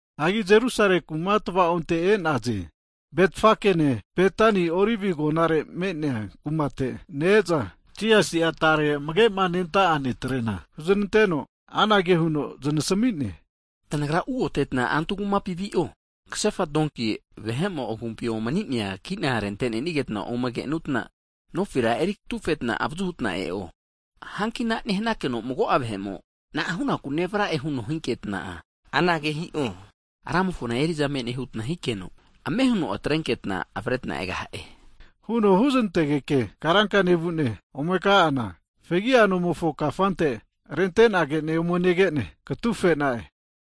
Hagi Jerusale kuma tva'onte e'naze. Betfakene Betani Olive agonare me'nea kumate ne-eza, Jisasi'a tare amage'ma nenta'a disaipol netrena huznanteno, anage huno znasami'ne, tanagra ugoteta antu kumapi vi'o. Kasefa donki vahe'mo'a agumpi omninenia kina arente nenigeta ome kenutna, nofira eri katufetna avazu huta e'o. Hanki ana nehnakeno mago'a vahe'mo, na'a hu'naku nevra'e huno hinketna'a? anage hi'o, Ramofona eriza me'ne hutna hikeno, ame huno atrenketna avretna egaha'e. Huno huznantegeke karanka nevu'ne ome ka'ana, fegia nomofo kafante rente'nagene ome negene katufe'na'e.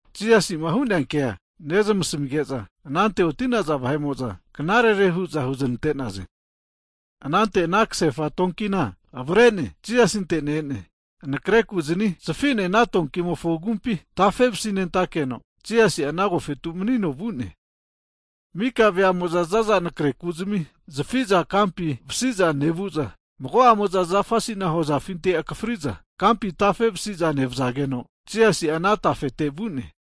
Jisasi'ma hu'nea kea nezmasmige'za, anante'ma oti'naza vahe'mo'za knarere hu'za huznante'naze. Anante ana kasefa donkina avre'ne Jisasinte ne-ene anakreku'zani zafi'ne ana donkimofo agumpi tafevasi nentakeno, Jisasi'a ana agofetu manino vu'ne. Mika veamo'za zaza anakre ku'zimi zafiza kampi vasiza nevu'za, mago'amoza zafa asina hozafinti akafri'za kampi tafe vasiza nevzageno, Jisasi'a ana tafete vu'ne.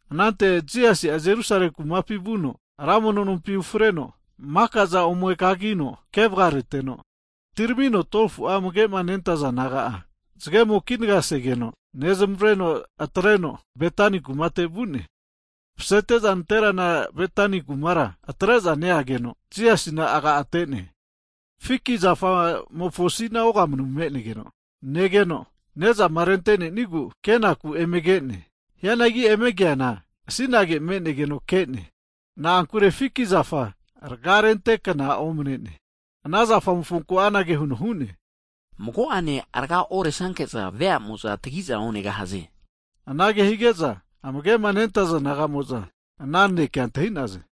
Anante Jisasi'a Jerusale kumapi vuno, ra mono nompi ufreno maka'za ome kagino ke vgareteno, atiramino 12fu'a amage'ma nentaza disaipol naga'a zgemo kinaga segeno nezamavreno atreno Betani kumate vu'ne. Masete'za nanterana Betani kumara atre'za neageno, Jisasina aga ate'ne. Fiki zafa'mofo asina ogamanu me'negeno negeno, nezama rente'nenigu kenaku eme ke'ne. Hianagi eme keana asinage me'negeno ke'ne. Na'ankure fiki zafa raga rentekna omane'ne. Ana zafa mofonku anage huno hu'ne, mago'ene rga oresnanke'za veamo'za tagi'za onegahaze. Anage hige'za amage'ma nentaza disaipol nagamo'za ana naneke antahi'naze.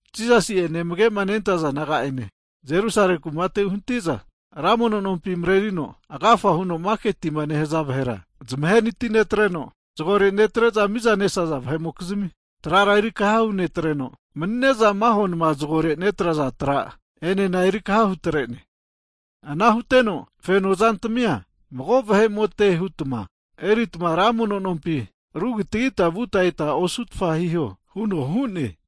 Jisasi'ene amagema nentaza disaipol naga'ane Jerusale kumate uhnati'za, ra mono nompi marerino, agafa huno maketima nehaza vahera zmahenati netreno, zagore netre'za miza nesaza vahe'mokizmi trara erikaha hunetreno, mani'ne'za maho nma zgore netraza tra enena erikaha hutrene. Ana huteno feno zantamia mago vahe'mote hutma eritma ra mono nompina aru kitagita vuta eta osutfa hiho huno hu'ne.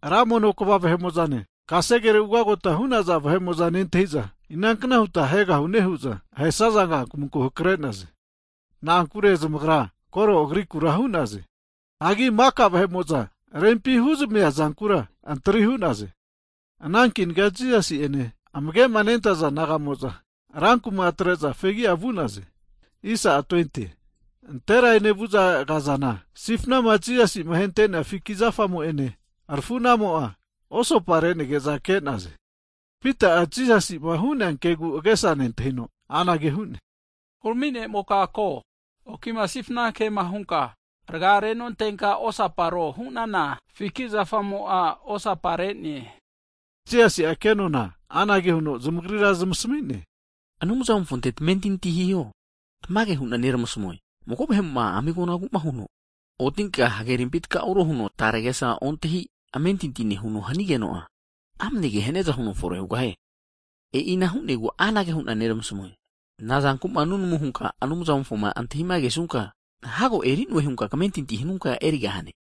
Ra mono kva vahe'mozane, kasegerema ugagota hu'naza vahe'mo'za nentahiza, inankna huta ahegahune hu'za ahesaza kankamunku hakrenaze. Na'ankure zmagra koro Agrikura hu'naze. Hagi maka vahe'mo'za rempima huzamia zankura antri hu'naze. Ana kinaga Jisasi'ene amage'ma nentaza disaipol nagamo'za, rankuma atre'za fegi'a vu'naze. Nantera enevu'za kazana, sifnama Jisasi'ma ahente'nea fiki zafamo'ene arfu'na'amo'a, osapa re'nege'za ke'naze. Pita'a Jisasi'ma hu'nea kegu age'sa nentahino anage hu'ne, Hurami ne'moka ko! Okima sifna kema hunka raga renontenka osaparo hu'nana Fiki zafamo'a osapa re'ne. Jisasi'a kenona anage huno zamagrira zmasami'ne, Anumzamofonte tamentinti hiho. Tmage hu'na neramasamue, mago vahe'mo'ma ami agonagu'ma huno, otinka hagerimpi takauro huno tare agesa ontahi amentinti nehuno hanigeno'a, amane ke haniaza huno fore hugahie. E'ina hu'negu anage hu'na neramasamue. Nazankuma nunamu hunka Anumzamofo antahima kesunka, hago eri'noe hunka kamentinti hanunka erigahne.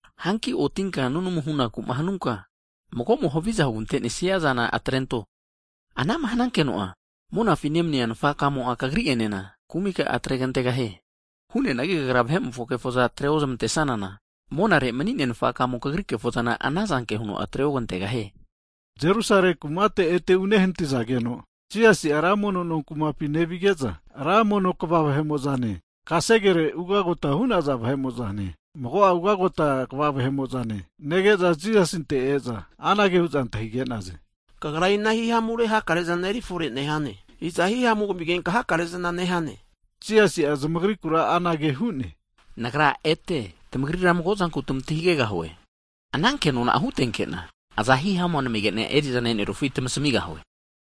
Hagi otinka nunamu hunakuma hanunka, mago'mo haviza hugante'nesnia zana atrento, anama hanunkeno'a, monafi nemania Nafakamo'a kagri'enena kumika'a atregantegahie. [Hu'neanagi kagra vahe'mofo kefoza atre ozmantesanana, monare mani'nea Nfakamo kagri kefozana anazanke huno atre ogantegahie.] Jerusale kumate ete uhnatizageno, Jisasi'a ra mono no kumapi nevige'za, ra mono kva vahe'mo'zane, kasegere ugagota hu'naza vahe'mo'zane, mago'a ugagota kva vahe'mo'zane, nege'za Jisasinte e'za, anage hu'za antahige'naze, Kagra ina hihamure hakare zana eri fore nehane? Iza hihamua kamigenka hakare zana nehane? Jisasi'a zamagri kura anage huno hu'ne, Nagra ete tamagrira mago'zanku tmantahigegahue, ana kenona'a hutenkena, aza hihamu namigena erizana e'nerufi tmasmigahue.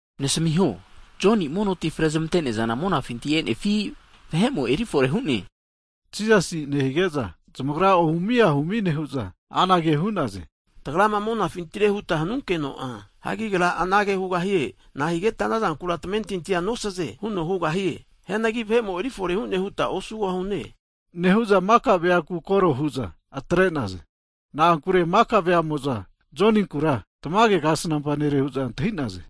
Nasamiho, Joni mono ti frezmante'nea, zana monafinti e'nefi, vahe'mo erifore hu'ne? Jisasi nehige'za zamagra ohumi ahumi nehu'za anage hu'naze. Tagrama monafintire huta hanunkeno'a, Agra anage hugahie. Hagi nahigetma tamentinti ana zankura nosaze huno hugahie? Hianagi vahe'mo eri fore hu'ne, huta osugosune, nehu'za maka veaku koro hu'za atre'naze. Na'ankure maka veamo'za Joninkura, tamage kasnampa nere hu'za antahinaze.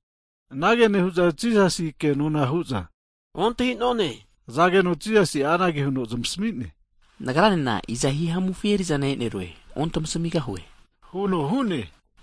Anage nehu'za Jisasina kenona hunte'ze, ontahinone hazageno Jisasi'a anage huno zmasami'ne, Nagranena iza hihamufi eri'zana enerue ontamasmigahue huno hu'ne.